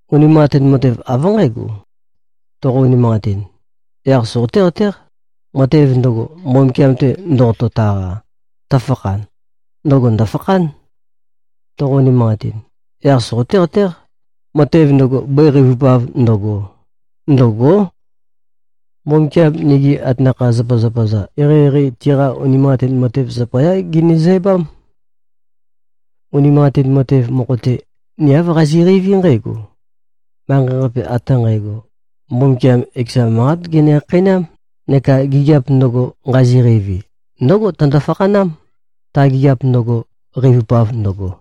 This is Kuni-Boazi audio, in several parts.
Unimanqatin matev, av nqǽgo: Toqo-unimanqatin, yaq soqoté-qatéq, matev ndøgo, Mbumbukiam-te ndoqoto-taqa, tøfakhan, ndøgo ndø̀fakhán. Toqo-unimanqatin, yaq soqoté-qatéq, matev ndøgo, bøi qeivupav ndøgo, ndø̂gó. Mbumbukiam nigi atanakha-zapazapa-za, eqeieqei tiqa unimanqatin matev zapayá genezæbám. Unimanqatin matev mokho-te, ni āv qazi꞉qeiví nqǽgo: Manqei-qape ate nqægo, Mbumbukiam ekeza manqát gene-khakheinám, neka gigiap ndøgo, nqazi-qeivi, ndǿgo tøndo-fakhanám, ta gigiap ndøgo, qeivupav ndøgo.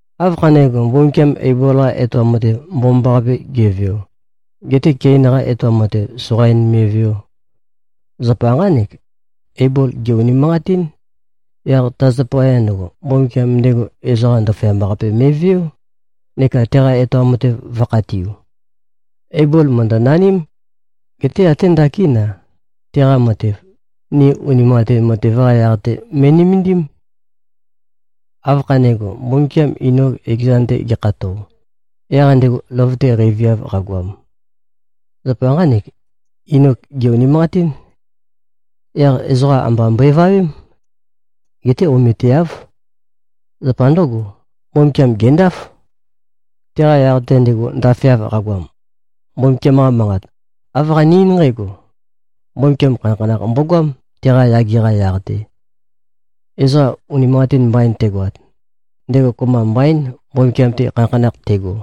Áv khanégo, Mbumbukiam Eibol-qa etoam matev, mbomambaqape ge꞉veo, getē Kein-qa etoam matev, soqain me꞉veō? Zapa nqánek: Eibol gè-unimanqatín. Yaq ta zapaya ndøgo, Mbumbukiam ndego ezoqa ndaføyamba-qape me꞉veó, neka teqa-etoam matev vø̄khatiu. Eibol mø̀ndønaním. Geté até ndakín-a, teqa matev, ni unimanqatin matev-qa yaq-te me꞉nømendím. Áv khanégo, Mbumbukiam Inok ekezan-te gekhato, yaq ndego løvøte qeiviav qagoam? Zapa nqánek: Inok gè-unimanqatín. Yaq ezoqa amba mbøevawém. Geté ometeáv. Zapa ndǿgo, Mbumbukiam gèndáf. Teqa yaq-te, ndego ndafeav qagoam, Mbumbukiam-qa Manqat, āv qane-eín nqǽgo: Mbumbukiam khanakhanakh mbogoám, teqa yage-qa yaq-te. Ezoqa unimanqatin mbain tegoat, ndego kopømba mbaín, Mbumbukiam-te khanakhanakh tego.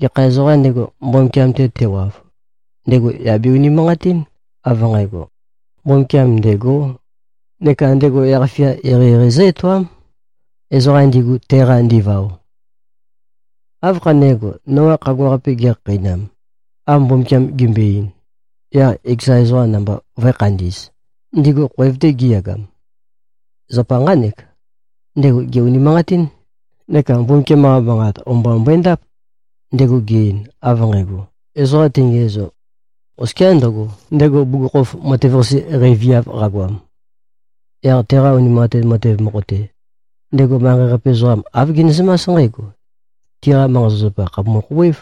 Gekha ezoqām ndego, Mbumbukiam-te tewav, ndego yà be-unimanqatín, av nqægo, Mbumbukiam ndêgō, neka ndego yaq-fia eqeieqei zǿ-etoám, ezoqam ndigu, teqa ndivao. Áv khanégo, Noa khagua-qape gekhakheinam, av Mbumbukiam gembøe-ein, yaq ekeza ezoqa namba vø̄e-khandi꞉z, ndigu khoev-te gi꞉yagam? Zapa nqánek: Ndego gè-unimanqatín neka Mbumbukiam-qa manqat o-mba mbøendáp, ndego ge-ein av nqægo, ezoqa tengiæzo, oskiá ndøgo, ndego bugukhokhof matev-qase qeiviav qagoam. Yaq teqa unimanqatin matev mokho-te, ndego manqei-qape ezoqam, āv genezømás nqǽgo: Tiqa manqa-zapazapa khàpumu-khouwév.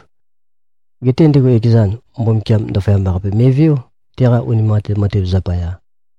Geté ndego ekezan, Mbumbukiam ndaføyamba-qape me꞉veó, teqa unimanqatin matev zapaya.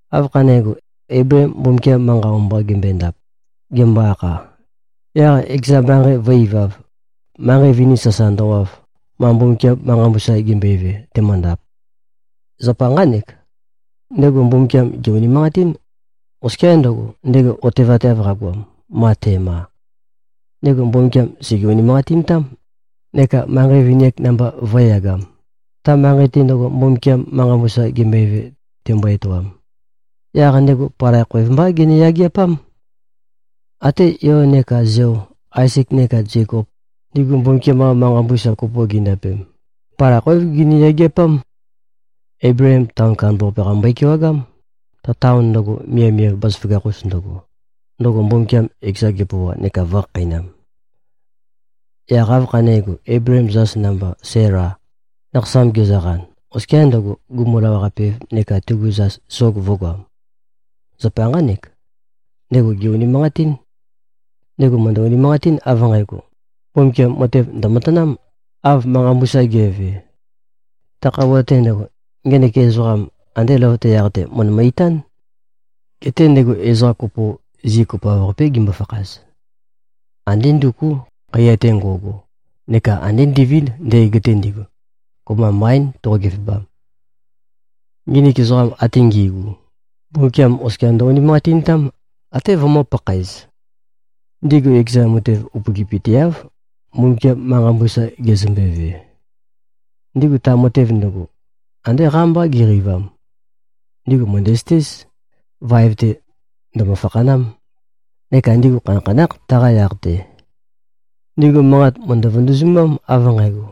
Áv khanégo, Eibleem Mbumbukiam-qa manqa o-mba gembøendap, gembo-akha, yaq ekeza manqei vø̄-ivav, manqei vini sasa ndøwav, ma Mbumbukiam manqa mbusa gembøeve, temøndap? Zapa nqánek: Ndego Mbumbukiam gè-unimanqatín, oskiá ndøgo, ndego otevateav qagoam, ma te꞉ma. Ndego Mbumbukiam sège-unimanqatintám, neka manqei vini-ak namba vø̄e-yagam, ta manqei-te ndøgo, Mbumbukiam manqa mbusa gembøeve, tembo-etoam. Yaq ndego palai khoev mbá gene-yageapám. Até yo neka zeo, Aezek neka Zekop, ndigu Mbumbukiam-qa manqa mbusa kopo gindapem, palai khoév gini-yageapám. Eibleem taon kandambaqape-qa mbøe-kewagám, ta taon ndøgo, miavmiav bazaføgakh-us ndøgo, ndøgo Mbumbukiam ekezan gepøoa neka vø̄khakheinam. Yaq áv khanégo, Eibleem zas namba, Sæla, nakhasam gezøqan, oskiā ndøgo, gumu-lawaqape-ev neka tegu zas sog vø̄goam? Zapa nqánek: Ndego gè-unimanqatín. Ndego mø̀ndø-unimanqatín, av nqægo, Mbumbukiam matev ndø̀matanám, av manqa mbusa ge꞉ve. Ta khøuwa-te ndøgo, ngenek ezoqam, andē løvøte yaq-te, mø̀ndømø-itán. Geté ndego ezoqa kopo, zi kopoav-qapé gimbo-fakhaz. Andé ndukú, khaiya-te nqo꞉go, neka andé ndivínd, ndøgeg-te ndigu. Kopømba mbaín, toqo-gevebam. Nginik ezoqa ate ngi꞉gu, Mbumbukiam oskia ndø-unimanqatintám, até vømø̄-pakhaez. Ndigu ekezan, matev upøgipøteáv, Mbumbukiam manqa mbusa gezømbeve. Ndigu ta matev ndøgo, andé qámbá qiqeivam. Ndigu mø̀ndæzøtéz, vaev-te ndø̀mø-fakhanám, neka ndigu khanakhanákh, taqa yaq-te. Ndigu manqat mø̀ndø-vøndøzumám, av nqægo,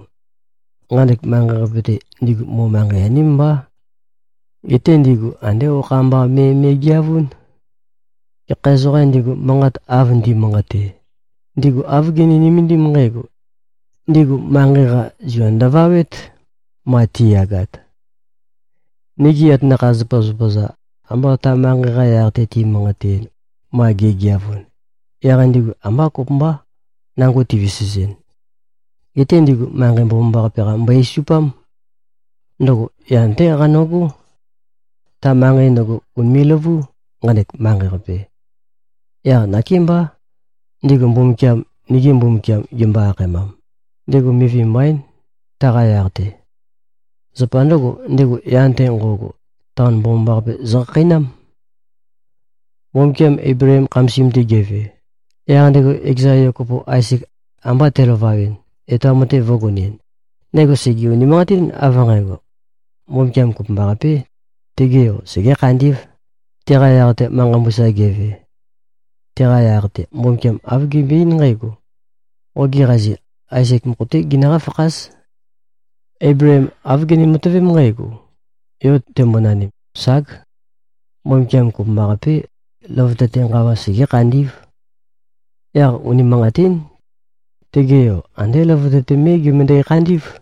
nqanek manqei-qape-te, ndigu mo-manqei-aním mbá. Geté ndigu andé okha mba me me꞉geavún. Gekha ezoqām ndigu, manqat av ndi꞉manqate, ndigu āv gini-nømendím nqǽgo: Ndigu manqei-qa, zua ndøvawét, ma ti꞉yagat. Nigi atanakha-zapazapa-za, amba ta manqei-qa yaq-te ti꞉manqateɨn, ma gi꞉geavun, yaq ndigu ambá kopømbá, nango tivesezɨn. Geté ndigu manqei mbomambaqape-qa mbøe-esupám. Ndøgo yan-té qano꞉gó. Ta manqei ndøgo, ùnime꞉-løvú, nqanek manqei-qape. Yaq nakémbá, ndigu Mbumbukiam, “nigi Mbumbukiam” gimbo-akhaemam, ndego mivi mbaín, taqa yaq-te. Zapa ndǿgo, ndego yan-te nqo꞉go, taon mbomambaqape zøkhakheinám. Mbumbukiam Eibleem khamasim-te geve, yaq ndego ekeza yo kopo, Aezek, amba telavawɨn, etoam matev vø̄gonɨn, ndego sège-unimanqatín, av nqægo: Mbumbukiam kopømbaqapé, tege yo segé-khandí꞉v, teqa yaq-te manqa mbusa geve. Teqa yaq-te, Mbumbukiam āv gembøe-eín nqǽgo, “Qogi qazi, Aezek mokho-té ginøqá-fakház.” Eibleem āv gene-matøvém nqǽgo: Yo tembonanim, ság, Mbumbukiam kopømbaqapé, løvøte-te nqawa segé-khandí꞉v. Yaq unimanqatín. Tege yo, andé løvøte-te mé gemøndæ-khandí꞉v.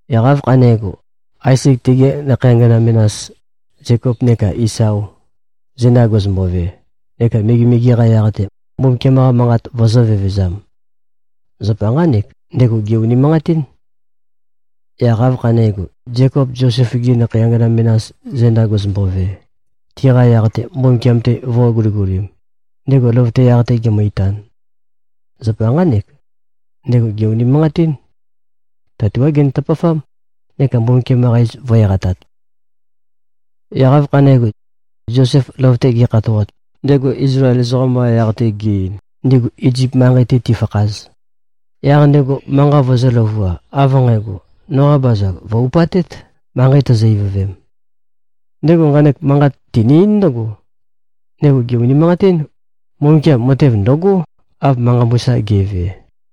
Yaq áv khanégo, Aezek tegi nakhei angana menas, Zekop neka Isao, zenda gezømbove, neka megemege-qa yaq-te, Mbumbukiam-qa manqat vøzø̄-vevezam? Zapa nqánek: Ndego gè-unimanqatín. Yaq áv khanégo, Zekop Zosef-gi nakhei angana menas zenda gezømbove, tiqa yaq-te Mbumbukiam-te vø̄guligulim, ndego løvøte yaq-te gemø-itan. Zapa nqánek: Ndego gè-unimanqatín. Tatuág genø-tøpafám, neka Mbumbukiam-qa iz vø̄-eqatat. Yaq áv khanégo, Zosef løvøte gekhatoat, ndego Izlael ezoqam-qa yaq-te ge-ein, ndigu Izip manqei-te tifakhaz, yaq ndego manqa vøzø̄-løvua, av nqægo, “Noqa bazag vø̀-upatét, manqei tozo-ivøvem?” Ndego nqanek manqat tene-eín ndǿgo: Ndego gè-unimanqatín, Mbumbukiam matev ndø̀gó, av manqa mbusa ge꞉ve.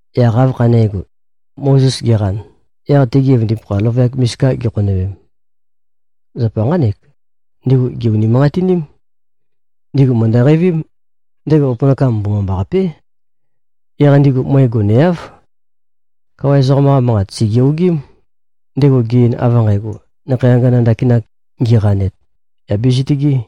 Yaq áv khanégo, Mozes geqan, yaq tegi evøndipakha løvøyak misika gikhonøwem? Zapa nqánek: Ndigu gè-unimanqatiním. Ndigu mø̀ndø-qeivím, ndego opønakam mbomambaqapé. Yaq ndigu møe goneáv. Kawa ezoqam-qa manqat sège-ogím, ndego ge-ein av nqægo, nakhei angana ndakin ngiqanet, yà bezitøgē.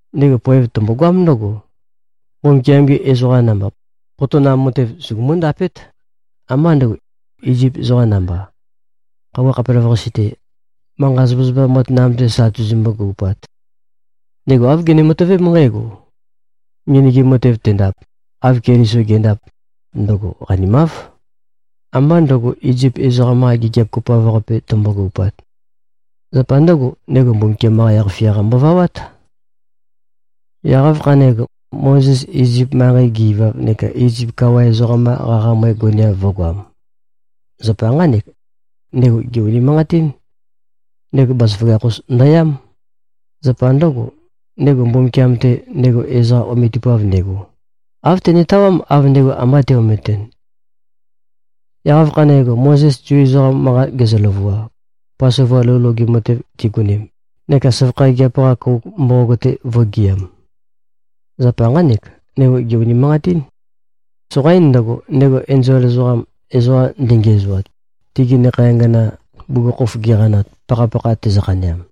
Ndego poev tømbogoám ndǿgo: Mbumbukiam-gi ezoqa namba, potonam matev sugumú-ndapét, ambá ndø̄go, Izip ezoqa namba, khøuwa khapelavøqasi-te, manqa-zapa matanam-te sa tuzumbu-gøupat. Ndego āv gene-matøvém nqǽgo: Ngenøgim matev tendap, av Keliso ge꞉ndap, ndøgo qanimáv, ambá ndø̄go, Izip ezoqam-qa gigiap kopoav-qape tømbo-gøupat. Zapa ndǿgo, ndego Mbumbukiam-qa yaq-fia-qa mbovawát. Yaq áv khanégo, Mozes Izip manqei ge-ivav neka Izip kawa ezoqam-qa qaqa møe goneav vø̄goam? Zapa nqánek: Ndego gè-unimanqatín. Ndego bazaføgakh-us ndøyám. Zapa ndǿgo, ndego Mbumbukiam-te, ndego ezoqa ometupav ndego, āv tenetawám, av ndego amba te-ometɨn. Yaq áv khanégo, Mozes Zu ezoqam manqa gezø-løvua, Pasova lou loge matev tigonem neka søvakha gigiap-qa kouk mboqog-te vō꞉gɨam. Zapa nqánek: Ndego gè-unimanqatín. Soqaín ndøgo, ndego enzol ezoqam, ezoqa ndengiæzoat, tigi nakhei angana bugukhokhof giqanat, pakhapakha tezø-khaneam.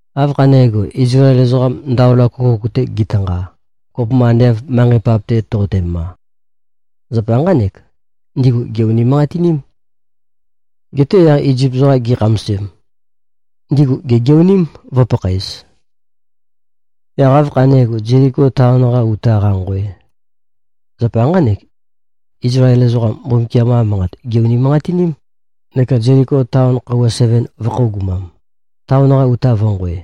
Áv khanégo, Izlael ezoqam, Ndaola Køkouk-te gitanqa, kopømba ande av manqei pap-te toqotema. Zapa nqánek: Ndigu gè-unimanqatiním. Geté yaq Izip ezoqam gi꞉khamasem, ndigu gègeoním, vø̄pakhaez. Yaq áv khanégo, Zeliko taon-qa uta qanqoe? Zapa nqánek: Izlael ezoqam, Mbumbukiam-qa manqat gè-unimanqatiním, neka Zeliko taon khøuwa seven vø̄khøogumam, taon-qa uta vø̄nqoe.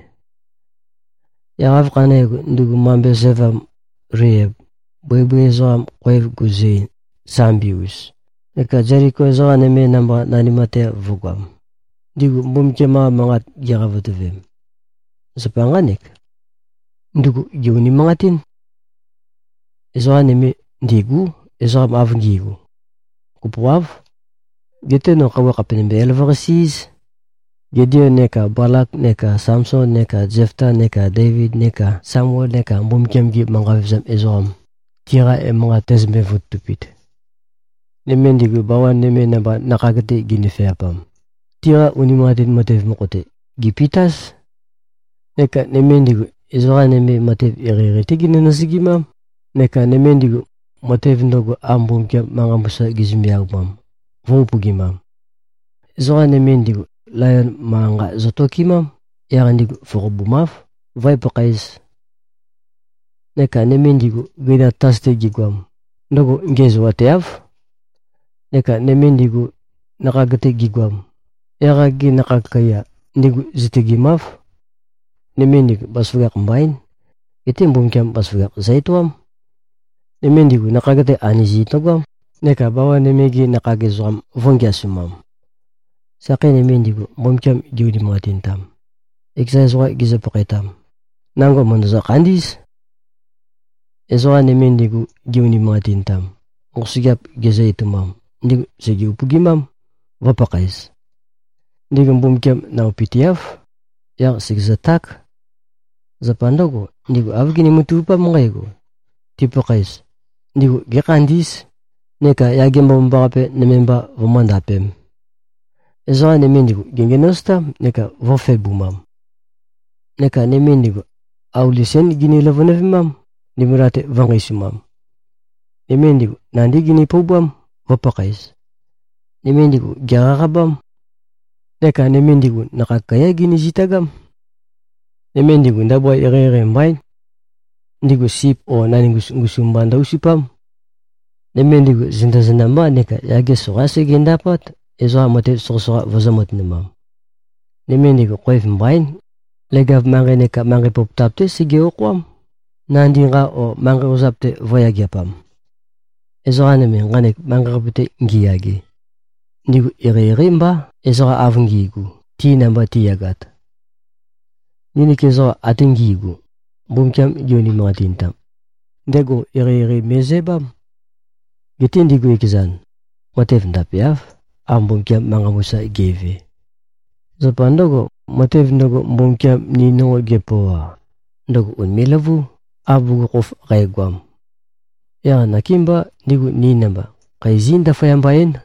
Yaq áv khanégo, ndugu mambe sævam, Leiab, bøibøi ezoqa khoev guzø-ein, sambi-us, neka Zeliko ezoqa nøme namba nanimateav vø̄goam, ndigu Mbumbukiam-qa manqat giqavotøvem? Zapa nqánek: Ndugu gè-unimanqatín. Ezoqa nøme ndîgú, ezoqam av ngi꞉gu. Kopoáv. Geté no khøuwa khàpe nømbe-elavøqasi-íz, Gideon neka Balak neka Samson neka Zefta neka Deivid neka Samuel neka Mbumbukiam-gi manqa vevezam ezoqam, tiqa emanqat tæzømbe-vototupit. Nøme ndigu, bawan nøme namba, nakhag-te ginøfeapam, tiqa unimanqatin matev mokho-te, gèpitáz. Neka nøme ndigu, ezoqa nøme matev eqeieqei-té ginøzø-nøzøgimám, neka nøme ndigu, matev ndøgo, av Mbumbukiam manqa mbusa gizømbe-aumam, vø̄-upøgimam. Ezoqa nøme ndigu, layon manqa-nqa zøtokemám. Yaq ndigu foqobumáv, vǿe-pakhaēz. Neka nøme ndigu, gøinam tatas-te gigoam, ndøgo ngiæzoateáv. Neka nøme ndigu, nakhag-te gigoam, yaq-ak-gi nakhag kaiya, ndigu zitøgemáv. Nøme ndigu, bazaføgakh mbaín. Geté Mbumbukiam bazaføgakh zø-etoám. Nøme ndigu, nakhag-te anøzi ndøgoám, neka bawan nøme-gi nakhag ezoqam vø̄ngeasumam. Sakhei nøme ndigu, Mbumbukiam gi-unimanqatintam, ekeza ezoqam gizø-pakhaetam, nango mø̀ndøzø-khandí꞉z. Ezoqa nøme ndigu, gi-unimanqatintam, nqosøgeap gizø-etoumam, ndigu sège-upøgimám, vø̄pakhaez. Ndigu Mbumbukiam naopøteáv, yaq sègezøták. Zapa ndǿgo, ndigu āv gini-matavupám nqǽgo: Tipakhaez, ndigu gékhandí꞉z, neka yage mbomambaqape nøme mba vømóndapēm. Ezoqa nøme ndigu, gèngenøzotám neka vø̄febumam. Neka nøme ndigu, auli sén gini-løvønøvemám, ndimbula-te vø̄nqeisumam. Nøme ndigu, nandí gini-poubám, vø̄pakhaez. Nøme ndigu, gèqaqabám. Neka nøme ndigu, nakhag kaiyá gini-zitagám. Nøme ndigu, ndabua eqeieqei mbaín. Ndigu sip o naningus ngusum mba ndø-usupám. Nøme ndigu zenda-zenda mbá neka yage soqaín segendapát, ezoqa matev soqøsoqa vøzø̄-matønumam. Nøme ndigu, khoev mbaín. Leg-av manqei neka manqei pøpotap-té sege-okhoám, nandi nqa o manqei ozap-te vø̄yageapam. Ezoqa nøme, nqanek manqei-qape-te ngiyage, ndigu eqeieqeí mbá, ezoqa av ngi꞉gu, ti namba ti꞉yagat. Nginik ezoqa ate ngi꞉gu, Mbumbukiam gi-unimanqatintam, ndego eqeieqei me꞉zæbám. Geté ndigu ekezan, matev ndapeáv, av Mbumbukiam manqa mbusa ge꞉ve. Zapa ndǿgo, matev ndøgo, Mbumbukiam ni nonqo gepøoa, ndøgo ùnime꞉-løvú, av bugukhokhof qægoam. Yaq nakémbá, ndigu ni namba, khæ zí-ndaføyamba-én.